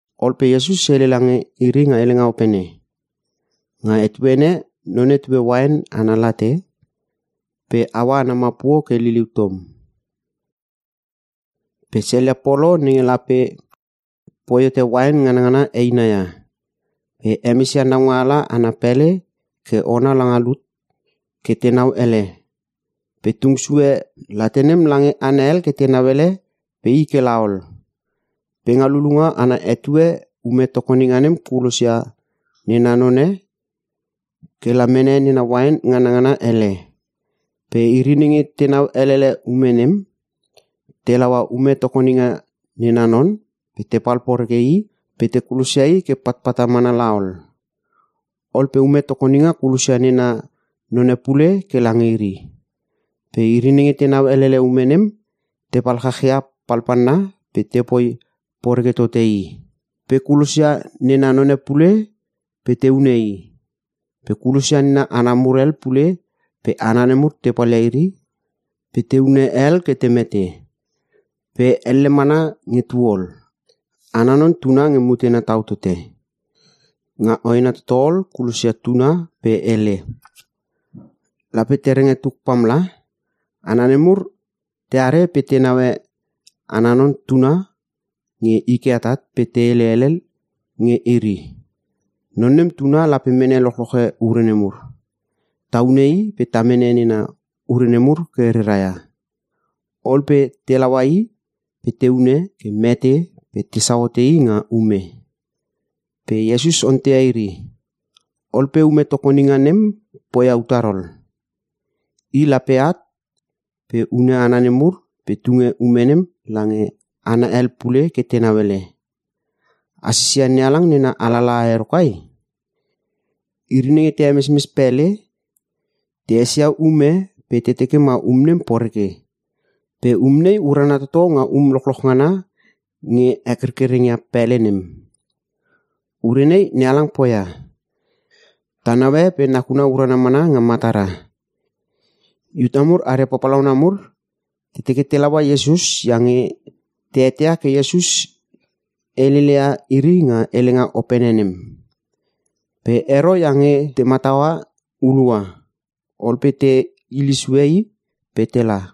Ol pe Iesus hele lange iri nga helenga opene, “Nga etuene e none tue uain ana late pe haua ana mapuo ke liliu tom. Pe selia polo nenge lape poi hote uain nganangana eina ia. Pe hemesia naungaala ana pele ke ona langa lut ke tenau ele. Pe tung sue late nem lange hana hel ke tenau ele pe i kela ol. Pe nga lulunga ana etue, ume tokoninga nem kulosia nena none ke la mene nena uain nganangana hele. Pe iri nenge tenau elele ume nem, te laua ume tokoninga nena non pe tepal poreke i pe te kulosia i ke patpata mana la ol. Ol pe ume tokoninga kulosia nena none pule ke lange iri. Pe iri nenge tenau elele ume nem tepal chachia palpalna pe tepoi poreke tote i. Pe kulosia nena none pule pe te hune i. Pe kulosia nena hana mur hel pule pe hana nemur te palia iri pe te hune hel ke te mete. Pe elle mana nge tu ol, ana non tuna nge mutena tau tote. Nga hoena toto ol kulosia tuna pe hele, ‘Lape te renge tuk pamla.’ Hana nemur teare pe te neue ana non tuna nge i ke atat pe te hele tele hel nge iri, ‘Non nem tuna lape mene lochloche ure nemur. Ta hune i pe ta mene nena ure nemur ke rera ia.’ Ol pe telaua i pe te hune ke mete pe tesau hote i nga ume.” Pe Iesus ontei, “Ol pe ume tokoninga nem poia utar ol? I lape at pe hune hana nemur pe tunge ume nem lange hana hel pule ke tenau ele. A sisia NeHalang nena alalaha ero kai? ‘Iri nenge te hemesmes pele, te esia um e pe te teke ma um nem poreke. Pe um nei urana toto nga um lochloch ngana nge hekerkereng ia pele nem. Ure nei NeHalang poia. Ta naue pe nakuna urana mana nga matara!’” Iuta mur aria papalauna nemur te teke te laua Iesus iange te eteia ke Iesus heleleia iri nga helenga opene nem. Pe ero iange te mataua hulua. Ol pe te hile sue i pe tela.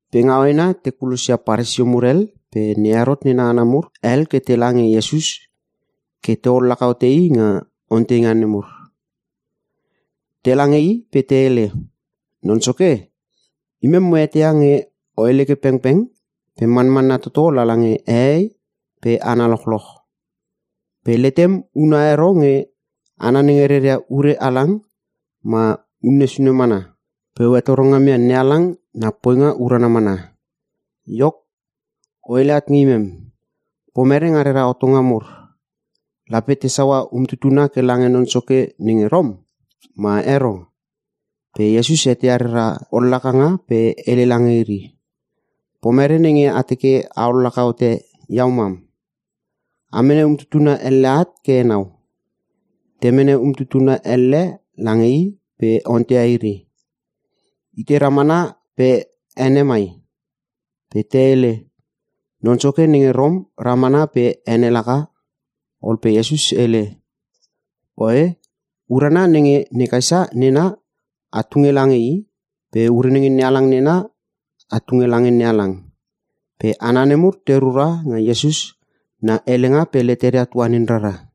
Pe nga hoena te kulosia Paresio mur hel pe ne Herot nena hana mur hel ke tela nge Iesus ke te ollaka hote i nga onteinga mur. Tela nge i pe te hele, “Non Soke, imem mo eteia nge o hele ke pengpeng pe manmanna toto lala nge hehei pe hana lochloch. Pe letem una ero nge hana nenge reria ure halang ma une sune mana. Pe o hetoro ngam ia NeHalang na poinga urana mana. Iok, o hele at nge imem. Pomere nga rera hotonga mur, lape ta saua umtutuna ke lange non soke nenge Rom, ma ero?” Pe Iesus eteia reria ollakanga pe hele lange iri, “Pomere nenge a teke a ollaka hote iau mam? A mene umtutuna elle at ke enau.” Te mene umtutuna elle lange i pe ontei ia iri, “Itei ramana pe ene mai?” Pe te hele, “Non Soke nenge Rom ramana pe ene laka.” Ol pe Iesus hele, “Oe, ure nenge ne Kaesa nena, a tunge lange i pe ure nenge NeHalang nena, a tunge lange NeHalang.” Pe hana nemur te rura nga Iesus na helenga pe leteria tuanin raria.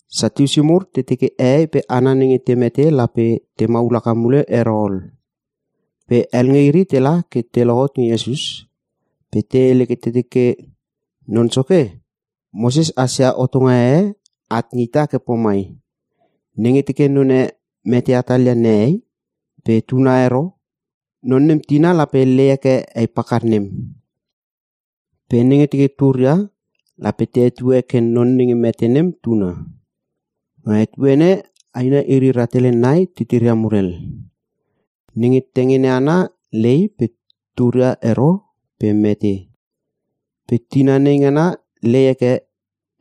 Satiusi mur te teke hehei pe hana nenge te mete lape te maul haka mule ero ol. Pe hel nge iri tela ke tehot nge Iesus pe te hele ke te teke, “Non Soke, Moses hasia hotonga e at nge ita ke pomai, ‘Nenge teke none mete hatalia nehei pe tuna ero. Non nem tina lape lei heke hei pakar nem. Pe nenge teke turia, lape te hetue ke non nenge mete nem tuna.’ Nga etuene e, aina iri rahtele nai titiria mur hel. Nenge tengene ana lei pe turia ero pe mete. Pe tina nei ngana lei heke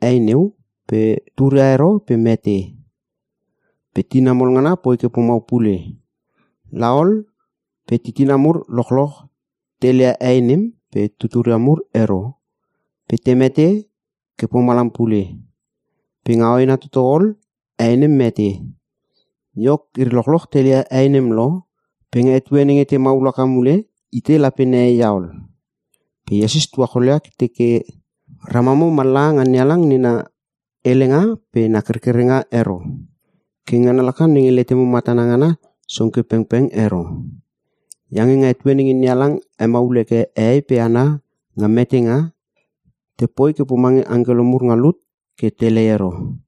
hei neu pe turia ero pe mete. Pe tina mol ngana poi ke pomau pule. La ol pe titina mur lochloch te leia hei nem pe tuturia mur ero pe te mete ke pomalam pule. Pe nga hoena toto ol, hei nem mete. Iok, iri lochloch te leia hei nem lo pe nga etue nenge te maul haka mule, itei lape nehei ia ol?” Pe Iesus tuacholia ke teke, “Ramamo mallaha nga NeHalang nena helenga pe na kerkerenga ero. Ke ngana laka nenge letemo matana ngana song ke pengpeng ero. Iange nga etue nenge NeHalang hemaul heke hehei pe hana nga metenga, tepoi ke pomange angkelo mur nga lut ke telei ero.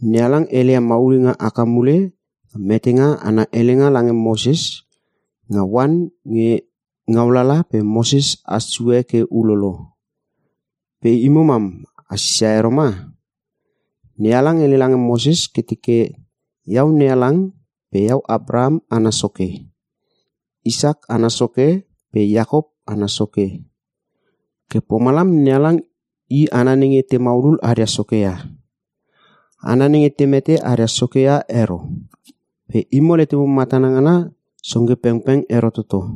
NeHalang heleia maulinga haka mule nga metenga ana helenga lange Moses nga oan nge ngaulala pe Moses has sue ke ulolo. Pe imo mam a sisia ero ma? NeHalang hele lange Moses ke teke, ‘Iau NeHalang pe Iau Apraham ana soke, Isak ana soke, pe Iakop ana soke.’ Ke pomalam, NeHalang i hana nenge te maululul aria soke ia. Hana nenge te mete aria soke ia ero. Pe imo letemo matana ngana song ke pengpeng ero toto!”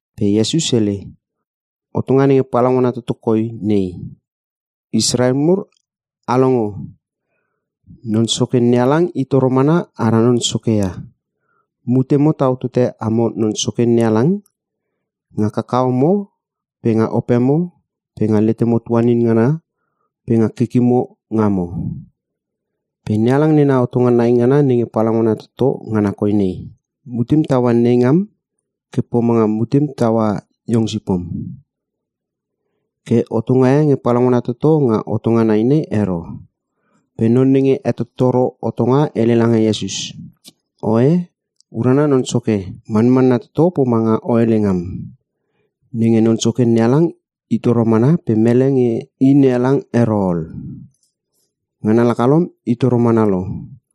Pe Iesus hele, “Hotonga nenge palaungana toto koi nei: ‘Israel mur, a longo. Non Soke NeHalang i toro mana ara Non Soke ia. Mutemo tau tote amo Non Soke NeHalang nga kakahomo pe nga opemo pe nga letemo tuanin ngana pe nga kikimo ngamo.’ Pe NeHalang nena hotonga nai ngana nenge palaungana toto ngana koi nei: ‘Mutem taua nei ngam ke pomanga mutemo taua iong sipom.’ Ke hotonga e nge palaungana toto nga hotonga nai nei ero.” Pe Non nenge hetottoro hotonga hele lange Iesus, “Oe, urana Non Soke. Manmanna toto pomanga o hele ngam, nenge Non Soke NeHalang i toro mana pe mele nge i NeHalang ero ol. Ngana laka lom i toro mana lo.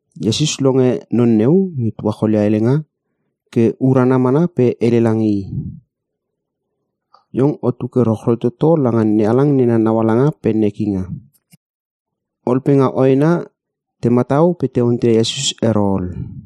Iesus longe non neu nge tuacholia helenga ke urana mana pe hele lange i, “Iong otu ke rochroi toto langa NeHalang nena naualanga pe nekinga.” Ol pe nga hoena te matau pe te onteia Iesus ero ol.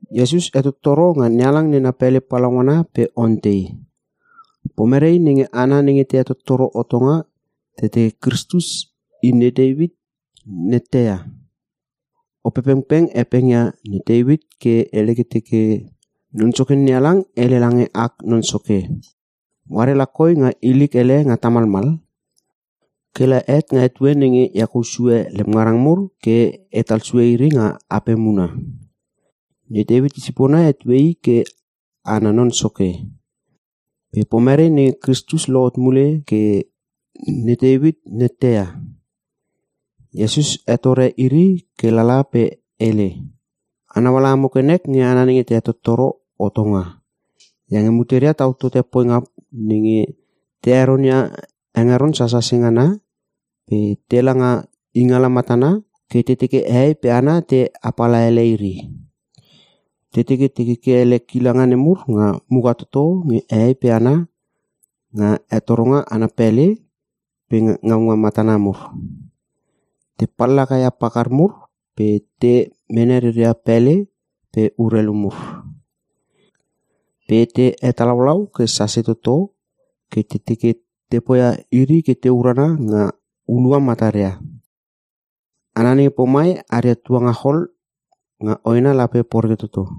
Iesus hetottoro nga NeHalang nena pele palaungana pe ontei, “Pomere nenge hana nenge te hetottoro hotonga te teke Kristus i ne Teuit nette ia? Opepengpeng hepengia ne Teuit ke hele ke teke, “‘Non Soke NeHalang hele lange ak Non Soke: “Oare la koi nga ilik hele nga tamalmal kela het nga etue nenge e hekou sue lem ngarang mur ke etal sue iri nga apem huna.” ’ Ne Teuit isipona hetue I ke ana Non Soke. Pe pomere nenge Kristus lohot mule ke ne Teuit nette ia?” Iesus hetore iri ke lala pe hele, “A nauele imo ke nek nge hana nenge te hetottoro hotonga iange muteria tau tote poinga nenge te heronia hengeron sasase ngana pe tela nga ingala matana ke te teke hehei pe hana te apala ele iri. Te teke te keke ele kilanga nemur nga muka toto nge hehei pe hana nga hetoronga ana pele pe nga ngaunga matana mur. Te pallaka ia pakar mur pe te mene reria pele pe urelu mur. Pe te hetalaulau ke sase toto ke te teke te poia iri ke te urana nga hulua mataria. Hana nenge pomai aria tuangachol nga hoena lape poreke toto.”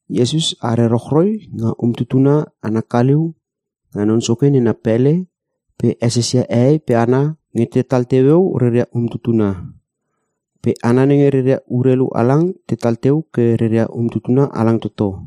Iesus are rochroi nga umtutuna ana kaliu nga Non Soke nena pele pe esesia hehei pe hana nge tetal teueu reria umtutuna. Pe hana nenge reria urelu halang tetal teu ke reria umtutuna halang toto.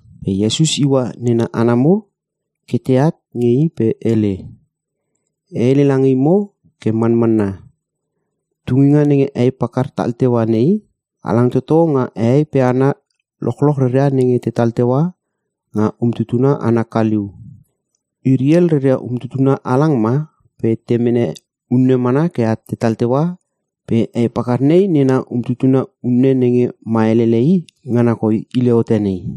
Pe Iesus iua nena hana mur ke teat nge i pe hele, “E hele lange imo ke manmanna, tunginga nenge hei pakar tal teua nei, halang toto nga hehei pe hana lochloch reria nenge tetal teu nga umtutuna ana kaliu. Iri hel reria umtutuna halang ma pe te mene unne mana ke at tetal teua pe hei pakar nena umtutuna unne nenge ma elele i ngana koi hile hote nei.”